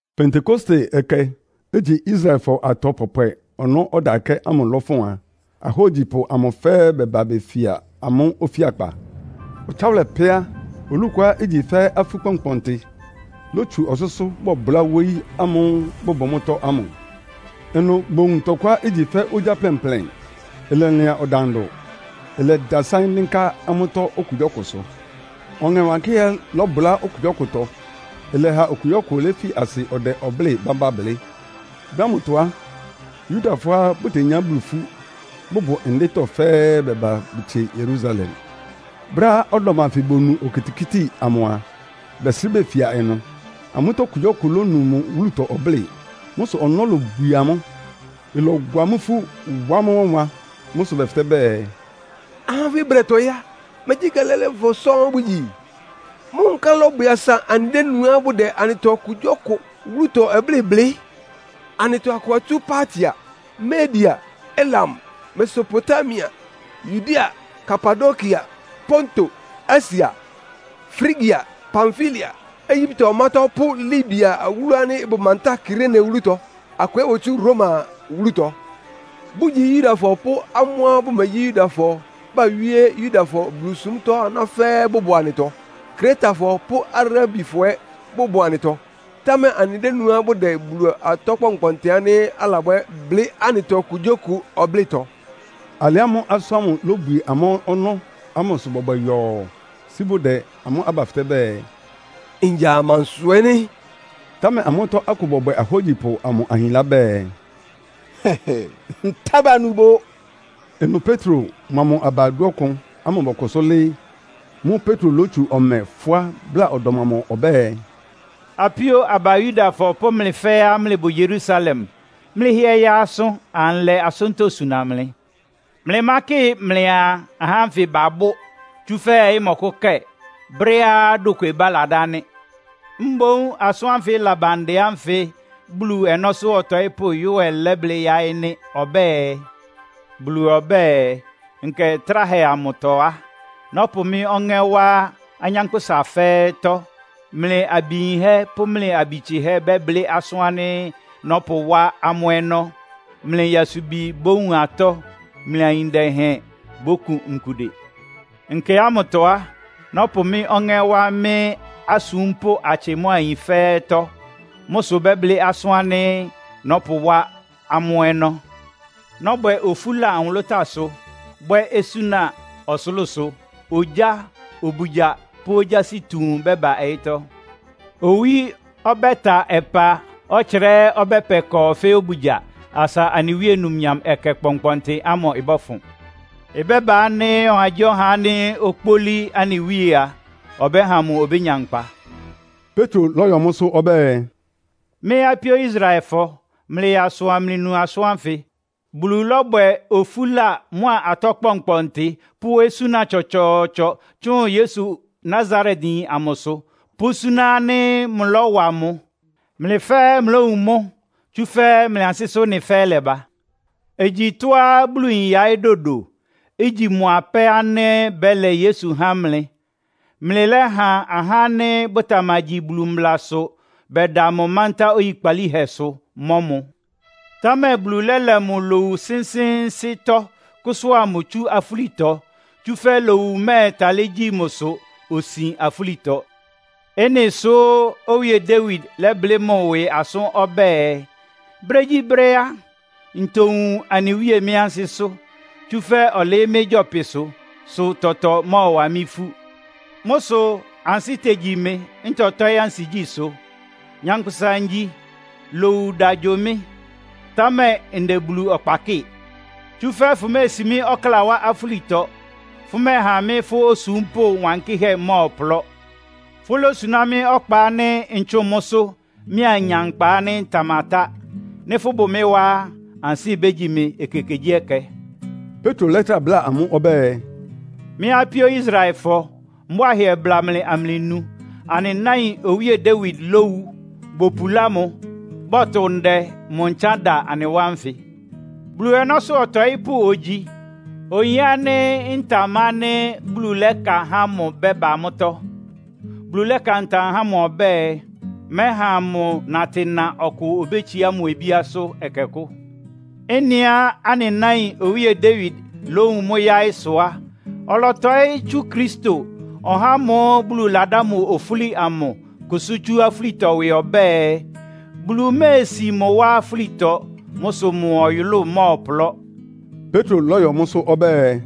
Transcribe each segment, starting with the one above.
Pentekoste Ɛkɛ, igyi Israelfɔ atɔ pɔpwɛ ɔnɔ́ ɔdakɛ́ ámʋ lɔfʋn a, ahógyipʋ amʋ fɛ́ɛ́ bɛba befia amʋ́ ofíakpa. Ɔtsáwʋlɛ pɛ́ á, olú kʋá igyi fɛ́ afú kpɔnkpɔntɩ ilotsu ɔsʋ́sʋ́ bɔbʋlá wóyí ámʋ́ʋ́ bʋbʋ mʋ́tɔ́ ámʋ. Ɩnʋ bowun tɔkʋá igyi fɛ́ ogya plɛnplɛn, ɩlɛlɩan ɔdandʋ. Ɩlɛdasáɩ́n dɩ́nká amʋ́tɔ́ okugyíɔkʋsʋ. Ɔŋɛ Wankɩ́hɛ́ lɔbʋlá okugyíɔkʋtɔ, ɩlɛha okugyíɔkʋ léfi asɩ ɔdɛ ɔblɩ́ɩ bámbá blɩ́. Brɛ́ ámʋtɔ á, Yudafɔá bʋtenyá Bulu ifú, bʋbʋ ndɩ́tɔ́ fɛ́ɛ́ baba bʋtsie Yerusalem. Brɛ́á ɔdɔm anfɩ bonu okitikíti amʋ a, bɛsrɩ́ befia ɩnʋ. Amʋ́tɔ́ okugyíɔkʋ lónu mʋ wúlutɔ ɔblɩ́ɩ. Mʋ́ sʋ ɔnɔ́ lobwie amʋ́. Ɩlɔwa amʋ́ ifú, wá amʋ́ wánwan. Mʋ́ sʋ bɛfɩtɛ́ bɛɛ, “Ahá ánfɩ bʋdɛtɔɩ́ á, megyí Galileafɔ sɔ́ɔ́n bʋgyi? Mʋ́ nkálɩ ɩlɔbwɛ asa anɩdénuá bʋdɛ anɩtɔ okugyíɔkʋ wúlutɔ ɔblɩ́ɩ blɩ́? Anɩtɔ akʋ atsú Partia, Media, Elam, Mesopotamia, Yudea, Kapadokia, Ponto, Asia, Frigia, Pamfilia, Egyipte ɔmátɔ́ pʋ́ Libia awúlu ánɩ́ ɩbʋ mantáa Kirene wúlutɔ. Akʋ ɛ́ botsú Roma wúlutɔ, bʋ́gyi Yudafɔ pʋ́ amʋ́á bʋmegyí Yudafɔ bawíé Yudafɔ Bulusúmtɔ́ aná fɛ́ɛ́ bʋbʋ anɩtɔ. Kretafɔ pʋ́ Arabifɔ ɛ́ bʋbʋ anɩtɔ. Támɛ anɩdénuá bʋdɛ Bulu atɔ kpɔnkpɔntɩ ánɩ́ alabwɛ́ blɩ́ anɩtɔ okugyíɔkʋ ɔblɩ́tɔ.” Alɩ ámʋ́ʋ́ asʋ́n ámʋ ilobwie amʋ́ ɔnɔ́ ámʋ sʋ bɔbwɛ yɔɔ, sí bʋdɛ amʋ́ aba fɩtɛ́ bɛɛ, “Ngya amansʋ ɛ́ nɩ́?” Támɛ amʋ́tɔ́ akʋ bɔbwɛ ahógyipʋ amʋ ahinlá bɛɛ, “Ntá banu bʋ.” Ɩnʋ Petro mʋa mʋ aba dúɔkʋn ámʋ bɔkʋsʋ́ lɩ́ɩ́. Mʋ́ʋ́ Petro lótsu ɔmɛ fʋ́á bláa ɔdɔm amʋ ɔbɛ́ɛ, “Apíó aba Yudafɔ pʋ́ mlɩ fɛ́ɛ́á mlɩbʋ Yerusalem, mlɩhɩɛ yaa asʋ, anlɛ asʋ́ntɔ́ suna mlɩ. Mlɩmákɩ mlɩaa ahá ánfɩ babʋ́, tsúfɛ́ ɔyɩ́ mɔkʋ́kɛ. Brɛ́á dokwebá ladá nɩ́. Mboún asʋ́n ánfɩ ɩlaba ndɛ ánfɩ Bulu ɔnɔ́sʋ́ ɔtɔɩ́pʋ́ Yoel lɛ́blɩ́ yáɩ́ nɩ́. Ɔbɛ́ɛ, ‘Bulu ɔbɛ́ɛ, “Nkɛ tráhɛ amʋtɔ á, nɔ́pʋ mɩ́ Ɔŋɛ́ wá anyánkpʋ́sa fɛ́ɛ́tɔ́. Mlɩ abi yinhɛ́ pʋ́ mlɩ abi tsɩhɛ́ bɛ́blɩ́ asʋ́n ánɩ́ nɔ́pʋwá amʋ́ ɔnɔ́. Mlɩ nyasubi bówun atɔ́. Mlɩ ayin dɛhɛn bókun nkude. Nkɛ ámʋtɔ á, nɔ́pʋ mɩ́ Ɔŋɛ́ wá mɩ́ asúmpʋ́ atsɩ mʋ́a ayin fɛ́ɛ́tɔ́. Mʋ́ sʋ bɛ́blɩ́ asʋ́n ánɩ́ nɔ́pʋwá amʋ́ ɔnɔ́. Nɔ́bwɛ ofúla nwʋlʋ́táasʋ, bwɛ́ osúna ɔsʋlʋ́sʋ. Ogyá, obugya pʋ́ ogyási tuun bɛ́ba ɔyɩ́tɔ́. Owí ɔbɛ́ta ɔpá. Ɔtsra ɛ́ ɔbɛ́pɛ kɔɔ fɛ́ obugya, asa anɩ Wíe numnyam ɛkɛ kpɔnkpɔntɩ ámʋ ɩbɔ́fʋn. Ɩbɛ́ba ánɩ́ ɔhagyíɔha ánɩ́ okpólí anɩ Wíe a, ɔbɛ́ha mʋ obénya nkpa.”’” Petro lɔ́yɔ mʋ́sʋ́ ɔbɛ́ɛ, “Mɩ́ apíó Israelfɔ, mlɩyaa asʋ amlɩnu asʋ́n ánfɩ. Bulu lɔ́bwɛ ofúla mʋ́a atɔ́ kpɔnkpɔntɩ pʋ́ osúna tsɔtsɔɔtsɔ tsʋn Yesu Nasaretyin amʋsʋ, pʋ́súná ánɩ́ mʋlɔ́wa mʋ. Mlɩ fɛ́ɛ́ mlɩlówun mʋ́, tsúfɛ́ mlɩ ansɩ́sʋ́ ɩ́nɩ fɛ́ɛ́ lɛba. Igyi tɔ́á Bulu yin yaɩ́ dodo, igyi mʋ apɛ́ ánɩ́ bɛ́lɛ Yesu há mlɩ. Mlɩlɛ́ha ahá ánɩ́ bʋtamagyi mblasʋ bɛda mʋ mántá oyikpalíhɛsʋ, mɔ́ mʋ. Támɛ Bulu lɛ́lɛ mʋ lowu sɩ́nsɩ́ɩ́nsɩ́ntɔ́, kʋ́sʋ́a mʋ tsú afúlitɔ. Tsúfɛ́ lowu mɛ́ɛtalɩ́ gyi mʋsʋ, osin afúlitɔ. Ɩ́nɩ sʋ́ Owíe Dawid lɛ́blɩ́ mʋ ɩwɩ asʋ́n ɔbɛ́ɛ, ‘Brégyíbrɛ́ á, ntowun anɩ Wíe mɩ́ ansɩ́sʋ́. Tsúfɛ́ ɔlɩɩ́ mɩ́ gyɔpɩsʋ, sʋ tɔtɔ mɔ́ɔwa mɩ́ ifú. Mʋ́ sʋ ansɩ́ tegyi mɩ, ntɔtɔ́ɩ́ ansigyísʋ́. Nyankpʋsa ngyi. Lowu da gyo mɩ́, támɛ ndɛ Bulu ɔkpa kɩ́ɩ. Tsúfɛ́ fʋméesi mɩ́ ɔkláa wá afúlitɔ. Fʋmɛ́ɛha mɩ́ fʋ́ osúmpʋ́ wankɩ́hɛ́ mmɔ́ɔplɔ́. Fʋ́lósuná mɩ́ ɔkpa ánɩ́ ntsʋ́ʋn mʋ́sʋ́, mɩ́ anya nkpa ánɩ́ ɩtamatá. Nɩ́ fʋ́bʋ mɩ́ wá á, ansɩ́ bégyi mɩ ekekegyíɛkɛ.’” Petro lɛ́trá bláa amʋ́ ɔbɛ́ɛ, “Mɩ́ apíó Israelfɔ, mbʋ́a hɩɛ bla mlɩ amlɩnu. Anɩ náin Owíe Dawid lówu, bopulá mʋ. Bɔ́tʋ ndɛ mʋ ntsán da anɩ wá nfɩ. Bulu ɔnɔ́sʋ́ ɔtɔɩ́pʋ́ ogyi, oyin ánɩ́ ntam ánɩ́ Bulu lɛ́ka há mʋ bɛ́ba mʋ́tɔ́. Bulu lɛ́ka ntam há mʋ ɔbɛ́ɛ, mɛ́ha mʋ natɩna ɔkʋ obétsiá mʋ obíásʋ́ ɛkɛ kʋ́. Ɩ́nɩá anɩ náin Owíe Dawid lówun mʋ́ yáɩ́ sʋ á, ɔlɔtɔɩ́ tsú Kristo, (ɔhá ámʋ́ʋ́ Bulu ladá mʋ ofúli amʋ) kʋsʋ́ tsú afúlitɔ ɩwɩ ɔbɛ́ɛ, ‘Bulu méesi mʋ wá afúlitɔ. Mʋ́ sʋ mʋ ɔyʋlʋ́ʋ mɔ́ɔplɔ́.’” Petro lɔ́yɔ mʋ́sʋ́ ɔbɛ́ɛ,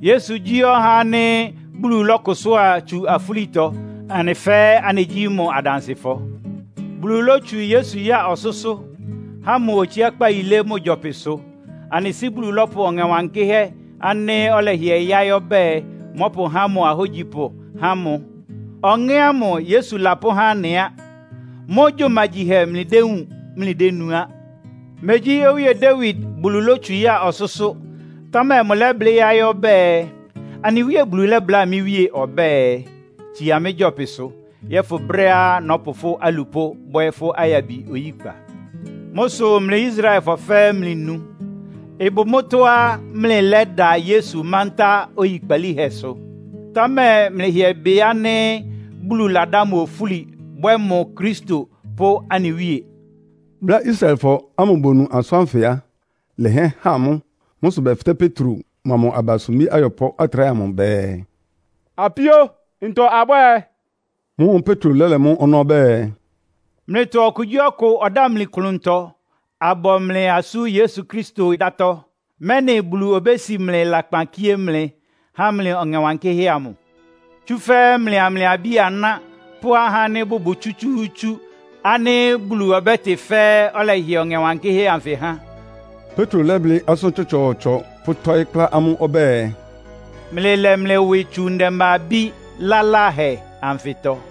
“Yesu gyí ɔhá ánɩ́ Bulu lɔ́kʋsʋ́a tsu afúlitɔ, anɩ fɛ́ɛ́ anɩgyí mʋ́ adansɩfɔ. Bulu lótsu Yesu ya ɔsʋ́sʋ́, há mʋ otsiákpá yilé mʋ gyɔpɩsʋ. Anɩ Sɩ́ Bulu lɔ́pʋ Ɔŋɛ Wankɩ́hɛ́ ánɩ́ ɔlɛhɩɛ yáɩ́ ɔbɛ́ɛ, mɔ́pʋhá mʋ ahógyipʋ há mʋ. Ɔŋɛ́ ámʋ Yesu lapʋ́há anɩ á. Mʋ́ gyumagyihɛ mlɩdéwúun, mlɩdénu á. Megyí Owíe Dawid Bulu lótsu ya ɔsʋ́sʋ́, támɛ mʋlɛ́blɩ́ yáɩ́ ɔbɛ́ɛ, ‘Anɩ Wíe Bulu lɛ́bláa mɩ́ Wíe ɔbɛ́ɛ, Tsia mɩ́ gyɔpɩsʋ, yɔ́fʋn brɛ́á nɔ́pʋ fʋ́ alupʋ́ bwɛ́ fʋ́ ayabi oyíkpa.’” “Mʋ́ sʋ mlɩ Israelfɔ fɛ́ɛ́ mlɩnu. Ɩbʋ mʋ́tɔ́á mlɩlɛ́da Yesu mántá oyikpalíhɛsʋ. Támɛ mlɩhɩɛ bɩ ánɩ́ Bulu ladá mʋ ofúli, bwɛ́ mʋ Kristo pʋ́ anɩ Wíe.” Brɛ́á Israelfɔ ámʋ bonu asʋ́n ánfɩ á, ɩlɛhɩɛ han amʋ́. Mʋ́ sʋ bɛfɩtɛ́ Petro mʋa mʋ aba sumbí ayɔpʋ́ atráhɛ amʋ bɛɛ, “Apíó, ntɔ abwɛ́ɛ?” Mʋ́ʋ́ Petro lɛ́lɛ mʋ́ ɔnɔ́ ɔbɛ́ɛ, “Mlɩtɔ okugyíɔkʋ ɔdámli klʋntɔ, abɔ mlɩ asú Yesu Kristo dátɔ́, mɛ́nɩ Bulu obési mlɩ lakpan kíé mlɩ, há mlɩ Ɔŋɛ Wankɩ́hɛ́ amʋ. Tsúfɛ́ mlɩa mlɩ abí-aná pʋ́ ahá ánɩ́ bʋbʋ tsútsúútsú ánɩ́ Bulu ɔbɛ́tɩ fɛ́ɛ́ ɔlɛhɩɛ Ɔŋɛ Wankɩ́hɛ́ anfɩ há.” Petro lɛ́blɩ́ asʋ́n tsɔtsɔɔtsɔ, pʋ́tɔ́ɩ́ kplá amʋ́ ɔbɛ́ɛ, “Mlɩlɛ mlɩ ɩwɩ tsu ndɛmba-abí laláhɛ anfɩtɔ.”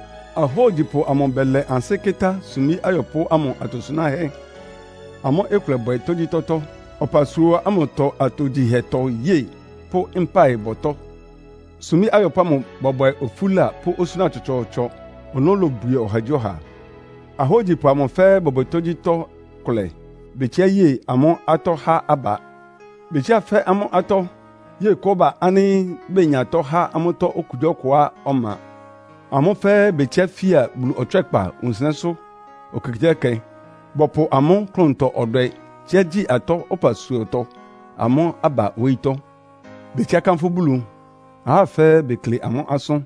Ahógyipʋ amʋ bɛlɛ ansɩ́ kɩ́tá sumbí ayɔpʋ́ ámʋ atosunáhɛ́, amʋ́ ɩkʋlɛbwɛ tógyítɔ́tɔ́, ɔpasua ámʋtɔ atogyihɛtɔ yée pʋ́ mpáɩbɔtɔ́. Sumbí ayɔpʋ́ ámʋ bɔbwɛ ofúla pʋ́ osúna tsɔtsɔɔtsɔ, ɔnɔ́ lobwie ɔhagyíɔha. Ahógyipʋ amʋ fɛ́ɛ́ bɔbwɛ tógyítɔ́ kʋlɛ. Betsiá ye amʋ́ atɔ́ há aba. Betsiá fɛ́ amʋ́ atɔ́, ye kɔ́ba ánɩ́ benyatɔ há amʋ́tɔ́ okugyíɔkʋá ɔma. Amʋ́ fɛ́ɛ́ betsiá fía Bulu ɔtswɛ́kpa wunsɩnɛ́sʋ́ ekekegyíɛkɛ. Bɔpʋ amʋ́ klʋntɔ-ɔdwɛ tsíá gyi atɔ́ ɔpasuatɔ amʋ́ aba wóyítɔ́. Betsiá kánfʋ́ Bulu, ahá fɛ́ɛ́ bekle amʋ́ asʋ́n,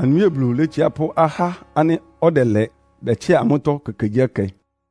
anɩ Wíe Bulu létsiá pʋ́ ahá ánɩ́ ɔdɛlɛ bɛtsɩá amʋ́tɔ́ ekekegyíɛkɛ.